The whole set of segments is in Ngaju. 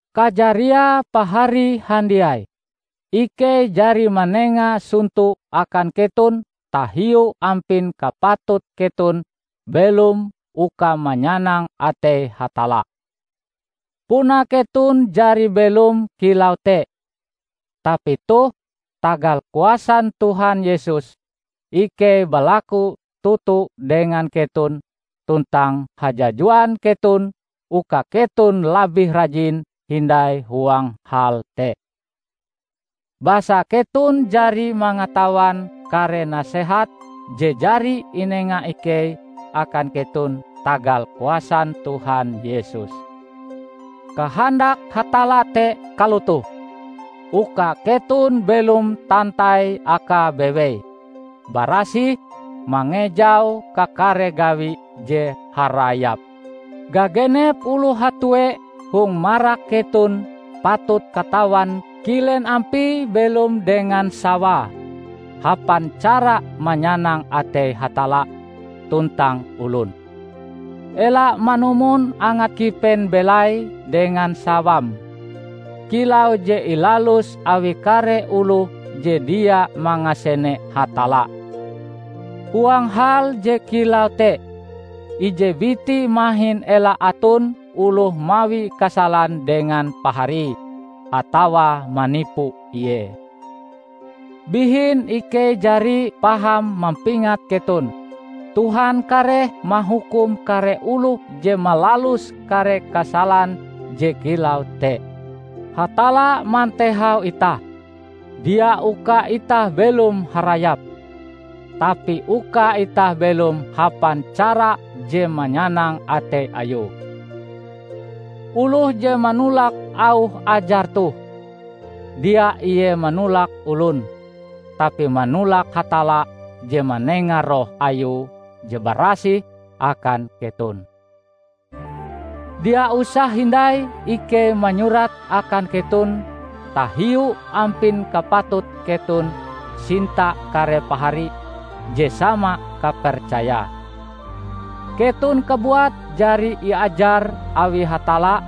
Kajariae pahari handiai, ikei jari manenga sonto akan keton tahiu ampin kapatut keton belom uka manyanang atei Hatalla. Puna keton jari belom kilau te. Tapi toh, tagal kuasan Tuhan Yesus, ikei balaku toto dengan keton tuntang hajajuan keton uka keton labih rajin hindai huang hal te! Basa keton jari mangatawan kare nasehat je jari inenga ikei akan keton tagal kuasan Tuhan Yesus. Kahandak Hatalla te kalotoh: Uka keton belom tantai Akae bewei, barasih, mangejau kakare gawi je harayap. Gagenep oloh hatue hong marak keton patut katawan kilen ampie belom dengan sawae hapan cara manyanang atei Hatalla tuntang olon. Ela manumon angat kipen belai dengan sawam, kilau je ilalus awi kare oloh je dia mangasene Hatalla. Huang hal je kilau te, ije biti mahin ela aton oloh mawi kasalan dengan paharie, atawa manipu ie. Bihin ikei jari paham mampingat keton, Tuhan kareh mahukum kare oloh je malalus kare kasalan je kilau te. Hatalla mantehau itah, dia uka itah belom harayap, tapi uka itah belom hapan cara je manyanang atei Ayue. Oloh je manolak auh ajar toh, dia ie manolak olon, tapi manolak Hatalla je manenga Roh Ayue je barasih akan keton. Dia usah hindai ikei manyurat akan keton tahiu ampin kapatut keton sinta kare pahari je sama kapercayae. Keton kabuat jari iajar awi Hatalla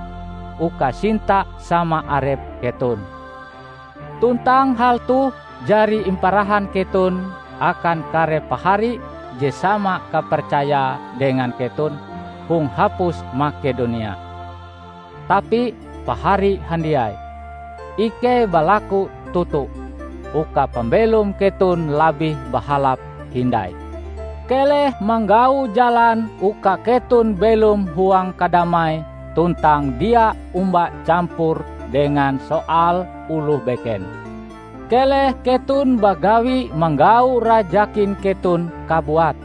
uka sinta sama arep keton. Tuntang hal toh jari imparahan keton akan kare pahari je sama kapercayae dengan keton hong hapus Makedonia. Tapi, pahari handiai, ikei balaku toto, uka pambelom keton labih bahalap hindai. Keleh manggau jalan uka keton belom huang kadamai tuntang dia omba campur dengan soal oloh beken. Keleh keton bagawi manggau rajakin keton kabuat,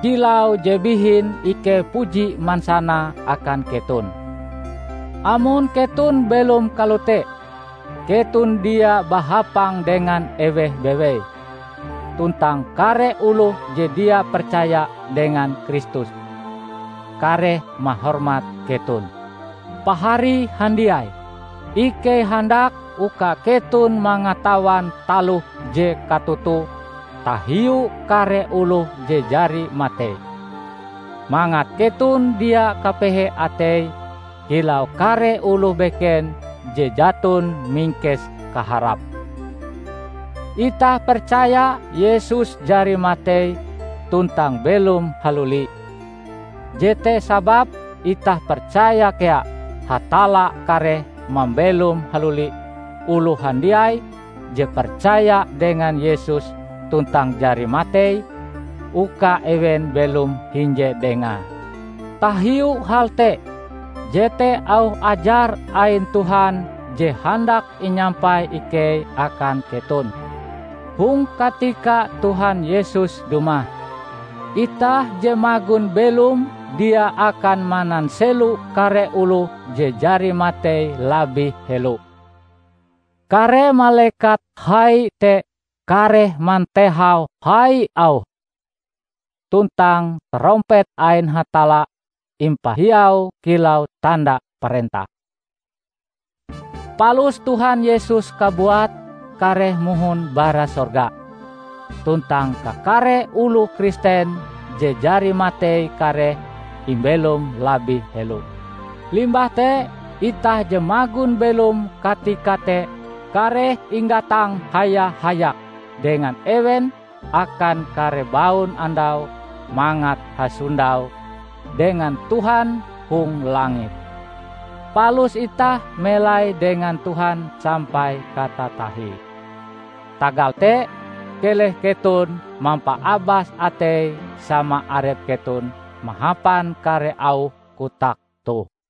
kilau je bihin ikei puji mansanae akan keton. Amon keton belom kalote, keton dia bahapang dengan eweh bewei, tuntang kare oloh je dia percaya dengan Kristus, kareh mahormat keton. Pahari handiai, ikei handak uka keton mangatawan taloh je katotoe tahiu kare oloh je jari matei; mangat keton dia kapehe atei kilau kare oloh beken je jaton mingkes kaharap. Itah percaya Yesus jari matei tuntang belom haluli, jete sababe itah percaya kea Hatalla kareh mambelom haluli oloh handiai je percaya dengan Yesus tuntang jari matei, uka ewen belom hinje Dengae. Tahiu hal te, jete auh ajar ain Tuhan je handak inyampai ikei akan keton: Hong katika Tuhan Yesus dumah, itah je magon belom dia akan mananselo kare oloh je jari matei labih helo. Kare malekat hai te kareh mantehau hai auhe tuntang tarompet ain Hatalla impahiau kilau tanda parentah. Palus Tuhan Yesus kabuat kareh mohon bara sorga, tuntang kakare oloh Kristen je jari matei kareh imbelom labih helo. Limbah te, itah je magon belom katika te kareh inggatang haya-hayak dengan ewen akan kare baun andau mangat hasondau dengan Tuhan hong langit. Palus itah melai dengan Tuhan sampai katatahie. Tagal te, keleh keton mampaabas atei sama arep keton mahapan kare auh kotak toh.